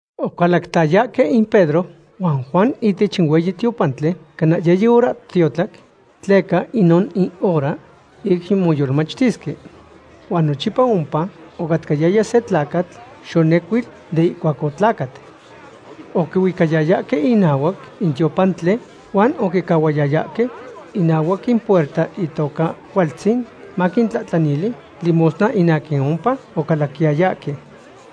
Ocalactayahque in Pedro huan Juan ihtech in hueyi tiopantli cana yiyi horahtiotlac, tleca inon in hora ic moyolmachtisque. Huan nochipa ompa ocatcayaya se tlacatl xonecuil de ihcuac otlacat. Oquihuicayayahque inahuac in tiopantli, huan oquicahuayayahque inahuac in puerta itoca Cualtzin, maquintlahtlanili limosna in aquin ompa ocalaquiyayahque.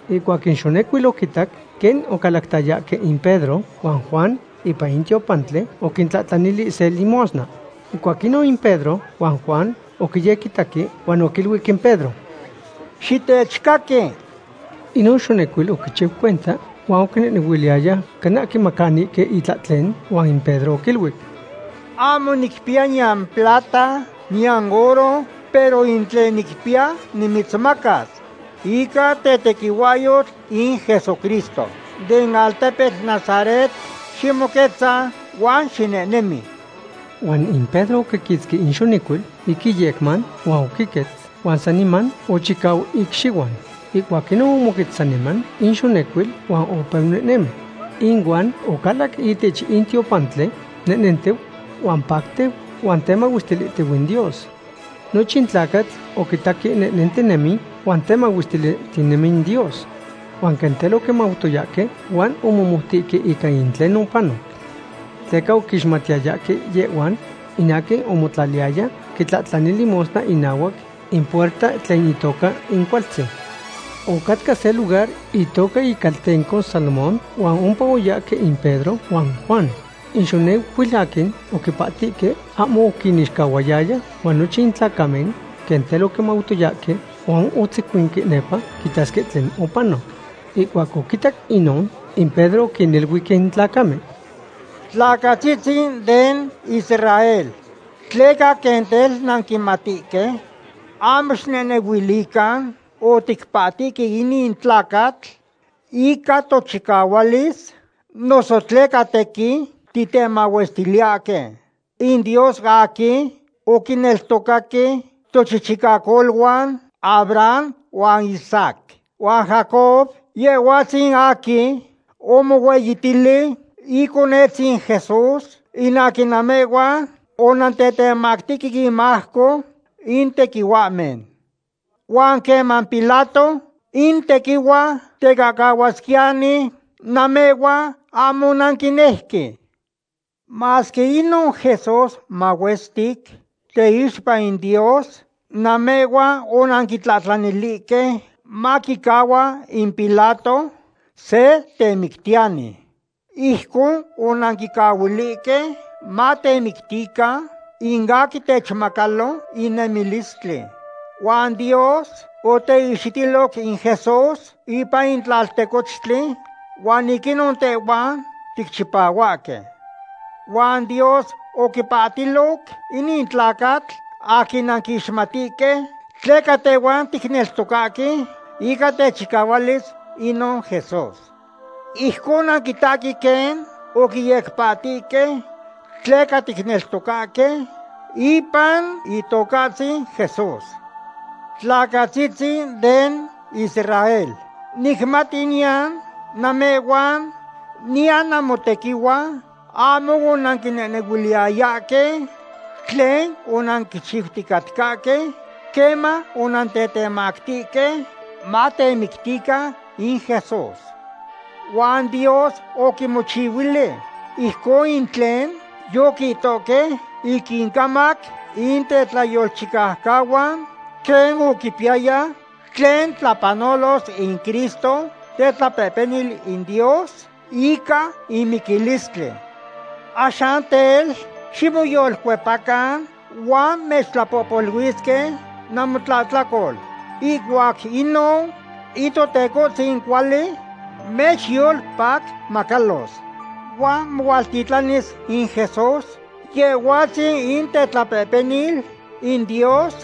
Ihcuac in xonecuil oquitac quen ocalactayahque in Pedro huan Juan ipan in tiopantli, oquintlahtlanili se limosna. Ihcuac inon in Pedro huan Juan oquiyequitaque huan oquiluic in Pedro: ―¡Xitechcaqui! Inon xonecuil oquichiu cuenta, huan oquinehnehuiliyaya cana quimacanihque itlahten. Huan in Pedro oquiluic: ―Ahmo nicpiya niyan plata niyan oro, pero in tlen nicpiya nimitzmacas. Ica tetequihuahyotl in Jesucristo den altepetl Nazaret, ximoquetza huan xinehnemi. Huan in Pedro oquiquitzqui in xonecuil ic iyecman huan oquiquetz huan saniman ochicau icxihuan. Ihcuac inon omoquetz saniman in xonecuil huan opeu nehnemi. Inuan ocalac ihtech in tiopantli nehnentiu huan patlantiu huan temahuestilihtiu in Dios. Nochin tlacatl oquitaque nehnentinemi huan temahuestilihtinemi in Dios. Huan quen tel oquimautoyahque huan omomoutihque ica in tlen opanoc. Tleca oquixmatiyayahque yehhua in aquin omotlaliyaya quitlahtlani limosna inahuac in puerta tlen itoca in Cualtzin. Ocatca se lugar itoca icaltenco Salomón huan ompa oyahque in Pedro huan Juan. In xonecuil aquin oquipahtihque ahmo oquinixcahuayaya huan nochin in tlacamen quen tel oquimautoyahque huan otzecuinque nepa quitasque tlen opanoc. Ihcuac oquitac inon, in Pedro oquiniluic in tlacamen: ―Tlacatzitzin den Israel, ¿tleca quen tel nanquimatihque? Ahmo xicnehnehuilican oticpahtihque inin tlacatl ica tochicahualis noso tleca tequin titemahuestiliyahque. In Dios aquin oquineltocaque tochichicacoluan Abraham huan Isaac huan Jacob, Yehhuatzin aquin omohueyitili Iconetzin Jesús, in aquin namehhuan onantetemactihque inmajco in tequihuahmen. Huan queman Pilato in tequihua tecahcahuasquiyani, namehhuan ahmo onanquinejque. Masque inon Jesús mahuestic teixpa in Dios, namehhuan onanquitlahtlanilihque maquicahcahua in Pilato se temictiyani. Ijcon onanquicahuilihque matemictican in aquin techmacalo in nemilistli. Huan Dios oteihxitiloc in Jesús ipan in tlaltecochtli, huan ic inon tehhuan ticchipahuahque. Huan Dios oquipahtiloc inin tlacatl aquin nanquixmatihque, tleca tehhuan ticneltocahque ica techicahualis inon Jesús. Ijcon nanquitahque quen oquiyecpahtihque tleca ticneltocahque ipan Itocahtzin Jesús. ’Tlacatzitzin den Israel, nicmati niyan namehhuan niyan namotequihuan ahmo onanquinehnehuiliyayahque tlen onanquichiuticatcahque queman onantetemactihque matemictican in Jesús. Huan Dios oquimochihuili ijcon in tlen yoquihtohque ic incamac in tetlayolchicaucahuan, quen oquipiyaya tlen tlapanolos in Cristo tetlapehpenil in Dios ica in miquilistli. Axan tel, ximoyolcuepacan huan mechtlapohpoluilisque namotlahtlacol. Ihcuac inon in Totecohtzin cuali mechyolpacmacalos. Huan mohualtitlanis in Jesús, Yehhuatzin in tetlapehpenil in Dios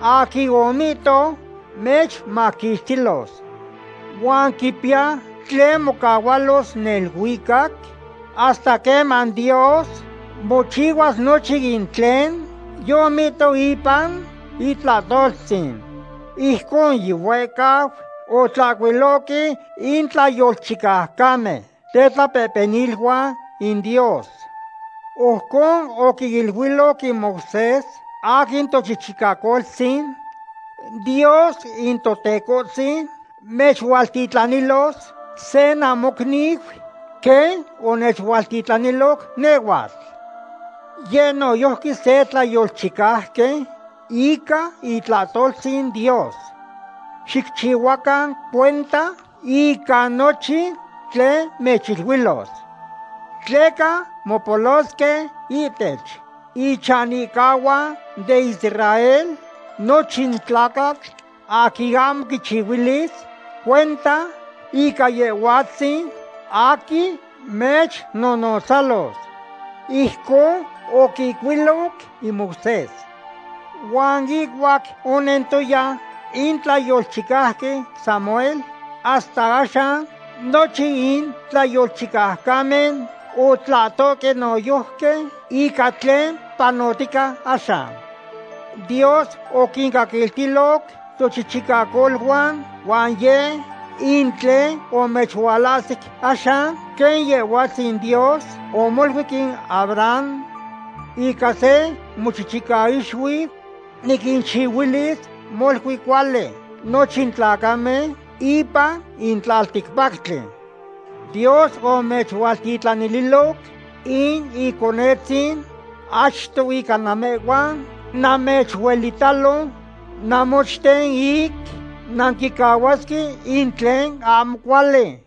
aquin omihtoc mechmaquixtilos. Huan quipiya tlen mocahualos neluicac hasta queman Dios mochihuas nochin in tlen yomihtoc ipan itlahtoltzin. Ijcon yihuehcau otlahcuilohque in tlayolchicaucamen tetlapehpeniluan in Dios. Ojcon oquiniluic in Moisés aquin tochichicacoltzin: “Dios in Totecohtzin mechualtitlanilos se namocniu, quen onechualtitlanilo nehhuatl. Yeh noyojqui se tlayolchicauqui ica itlahtoltzin Dios. Xicchihuacan cuenta ica nochin tlen mechiluilos. Tleca mopolosque ihtech ichanihcahuan den Israel nochin tlacatl aquin ahmo quichihuilis cuenta ica Yehhuatzin aquin mechnonotzalos.” Ijcon oquihcuiloc in Moisés. ’Huan ihcuac onentoya in tlayolchicauqui Samuel hasta axan, nochin in tlayolchicaucamen otlahtohque noyojqui ica tlen panotica axan. Dios oquincaquiltiloc tochichicacoluan huan yeh in tlen omechualahsic axan, quen Yehhuatzin Dios omoluic in Abraham: “Ica se mochichicaixuiu niquinchihuilis molui cuali nochin tlacamen ipan in tlalticpactli.” Dios omechualtitlanililoc in Iconetzin achto ica namehhuan, mamechuelitalo namochten ic nanquicahuasque in tlen ahmo cuali.